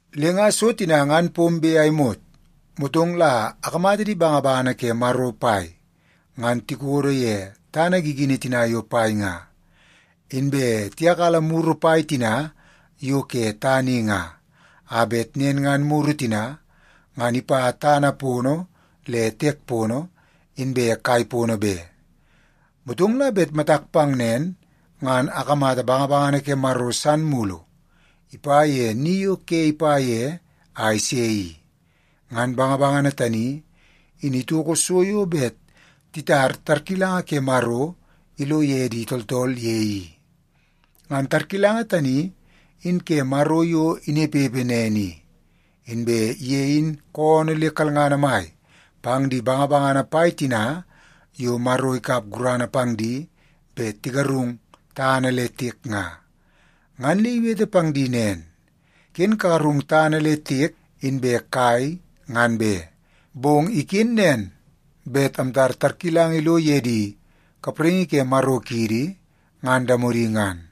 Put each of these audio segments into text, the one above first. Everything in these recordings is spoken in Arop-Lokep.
Le nga so tina ngan pombe a imot, motong la akamata di bangabangana ke Maro pai ngan tikodo ye tana gigini tina yo pai nga. Inbe tiyakala muru pai tina yo ke tana i nga, a bet nen ngan muru tina ngan ipa tana pono le tiek pono inbe kai pono be. Motong la bet matak pang nen, ngan akamata bangabangana ke Maro san mulu ipa ye ni yo ke ipa ye a ise i. Ngan bangabangana tani in itoko so yo bet titar tarkilanga ke Maro ilo ye di tooltool ye i. Ngan tarkilanga tani in ke Maro yo inepepe nen i. Inbe ye in koonoo le kalngana mai pang di bangabangana pai tina yo Maro ikap gurana pang di bet tigarung tana le tiek nga. Ngan le iwete pang di nen, “Ken kagarung tana le tiek inbe kai ngan be. Bong iken nen bet amtar tarkilanga ilo ye di kapraingi ke Maro kiidi ngan damodi ngan.”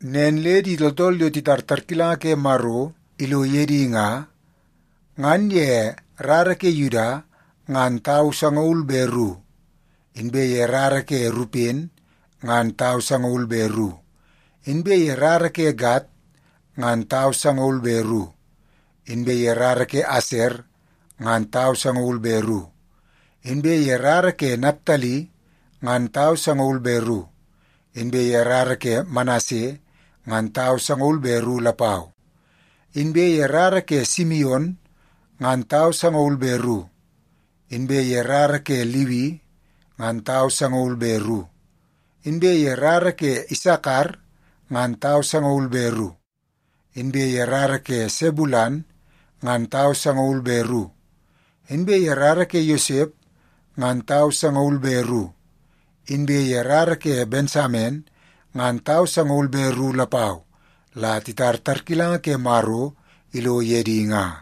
Nen le di tooltool yo titar tarkilanga ke Maro ilo ye di nga, ngan ye rara ke Yuda ngan tau sangaul be ru, inbe ye rara ke Rupen ngan tau sangaul be ru, inbe ye rara ke Gad ngan tau sangaul be ru, inbe ye rara ke Aser ngan tau sangaul be ru, inbe ye rara ke Naptali ngan tau sangaul be ru, inbe ye rara ke Manase ngan tau sangaul be ru lapau. Inbe ye rara ke Simion ngan tau sangaul be ru, inbe ye rara ke Liwi ngan tau sangaul be ru, inbe ye rara ke Isakar ngan tau sangaul be ru, inbe ye rara ke Sebulen ngan tau sangaul be ru, inbe ye rara ke Yosep ngan tau sangaul be ru, inbe ye rara ke Bensamen ngan tau sangaul be ru lapau la titar tarkilanga ke Maro ilo ye di nga.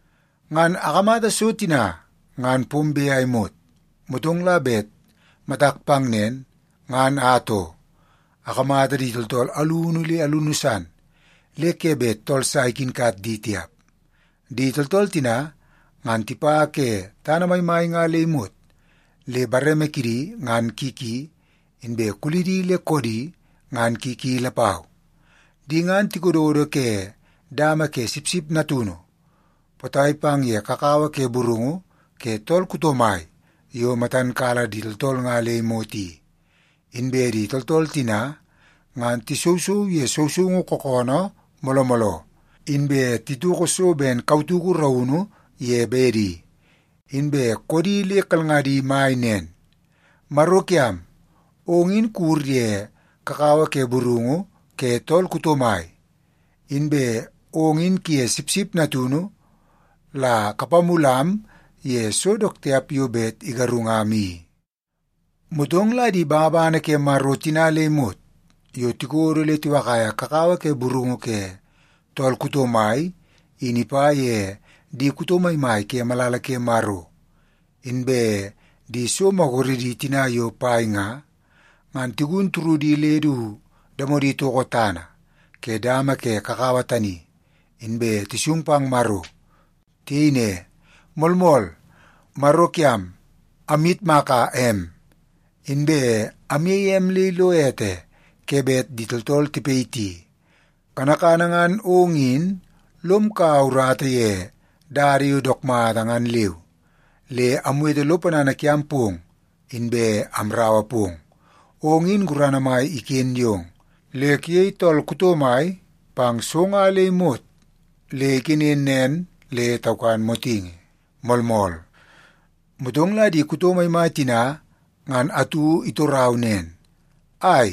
Ngan akamata so tina ngan pombe a imot, motong la bet matak pang nen, ngan atoo, akamata di tooltool alunu le alunu san le ke bet tool sa ikinkat di tiap. Di tooltool tina, ngan tipa ke tana maimai nga le imot, le bareme kidi ngan ki ki, inbe kulidi le koodi ngan ki ki lapau. Di ngan tikododo ke dama ke Sipsip Natunu potai pang ye kakawa ke burungu ke tool kuto mai yo matan kala di tooltool nga le imot i. Inbe di tooltool tina ngan tisousou ye sousoungu kookoonoo mooloo mooloo, inbe titoko so ben kautuku raunu ye bedi. Inbe koodi le kalngadi mai nen, “Maro kiam, ong in kuwur ye kakawa ke burungu ke tool kuto mai, inbe ong in kuye Sipsip Natunu la kapamulam ye so dook tiap yo bet igarungam i.” Motong la di bangabangana ke Maro tina le imot yo tikodo le tiwakaia kakawa ke burungu ke tool kuto mai in ipa ye di kuto maimai ke malala ke Maro, inbe di so maguredi tina yo pai nga, ngan tigun turudi le du damodi toko tana ke dama ke kakawa tani, inbe tisung pang Maro. Tiyei ne, “Moolmool! Maro kiam, amyitmaka em, inbe amyeie em le ilo ete ke bet di tooltool tipayiti. Kanakana ngan ong in lom kaua urata ye dada yo dook mata ngan leu, le amwete lo ponana kiam pong, inbe amraua pong. Ong in gurana mai iken yong, le kuyei tool kuto mai pang so nga le imot le iken nen le taukan motingi. Moolmool!” Motong la di kuto maimai tina ngan atu itorau nen, “Ai,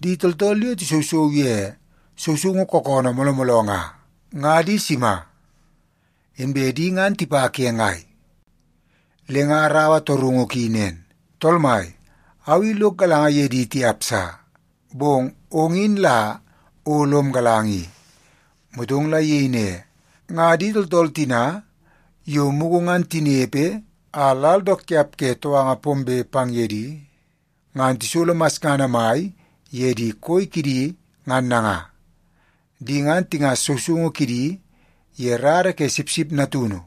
di tooltool yo tisousou ye sousoungu kookoonoo mooloo mooloo nga, nga di sima? Inbe di ngan tipa ke ngai?” Le nga araua torungu ki nen, “Tool mai, au i lok galanga ye di tiap sa, bong ong in la o lom galanga i.” Motong la iyei ne, “Nga di tooltool tina yo mugu ngan tinepe a lal dook tiap ke touanga pombe pang ye di ngan tisolo masngana mai ye di koi kidi ngan nanga. Di ngan tingas sousoungu kidi ye rara ke Sipsip Natunu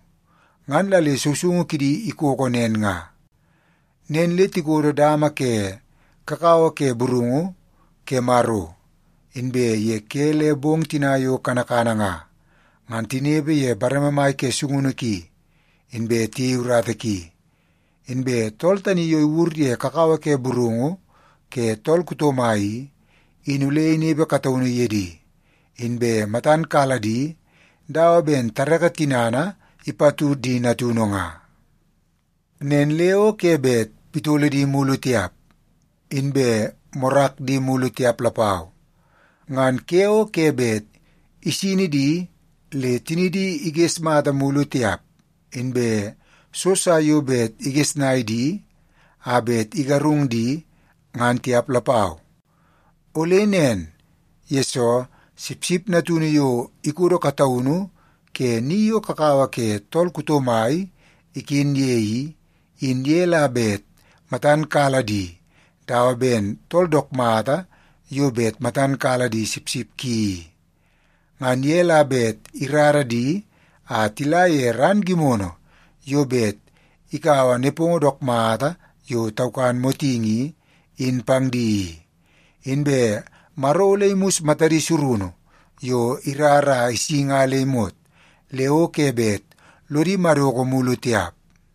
ngan la le sousoungu kidi ikoko nen nga. Nen le ‘tikodo dama ke kakawa ke burungu ke Maro, inbe ye ke le bong tina yo kanakana nga, ngan tinepe ye bareme mai ke sungunu ki, inbe tiyei urata ki. Inbe tool tani yo iwur ye kakawa ke burungu ke tool kuto mai i, in ole inepe kataunu ye di, inbe matan kala di dawa ben tareke tinana ipatud di natunu nga. Nen le o ke bet pitolo di mulu tiap, inbe morak di mulu tiap lapau. Ngan ke o ke bet isini di le tinidi iges mata mulu tiap, inbe so sa yo bet igesnai di a bet igarung di, ngan tiap lapau. Ole nen, yesoo Sipsip Natunu yo ikodo kataunu ke ni yo kakawa ke tool kuto mai iken ye i, in ye la bet matan kala di dawa ben tool dook mata yo bet matan kala di sipsip ki i. Ngan ye la bet irara di a tila ye ran gimono yo bet ikaua nepongo dook mata yo taukan motingi i, in pang di i. Inbe Maro ole imus matadi surunu yo irar a isi nga le imot, le o ke bet lodi madoko mulu tiap.’”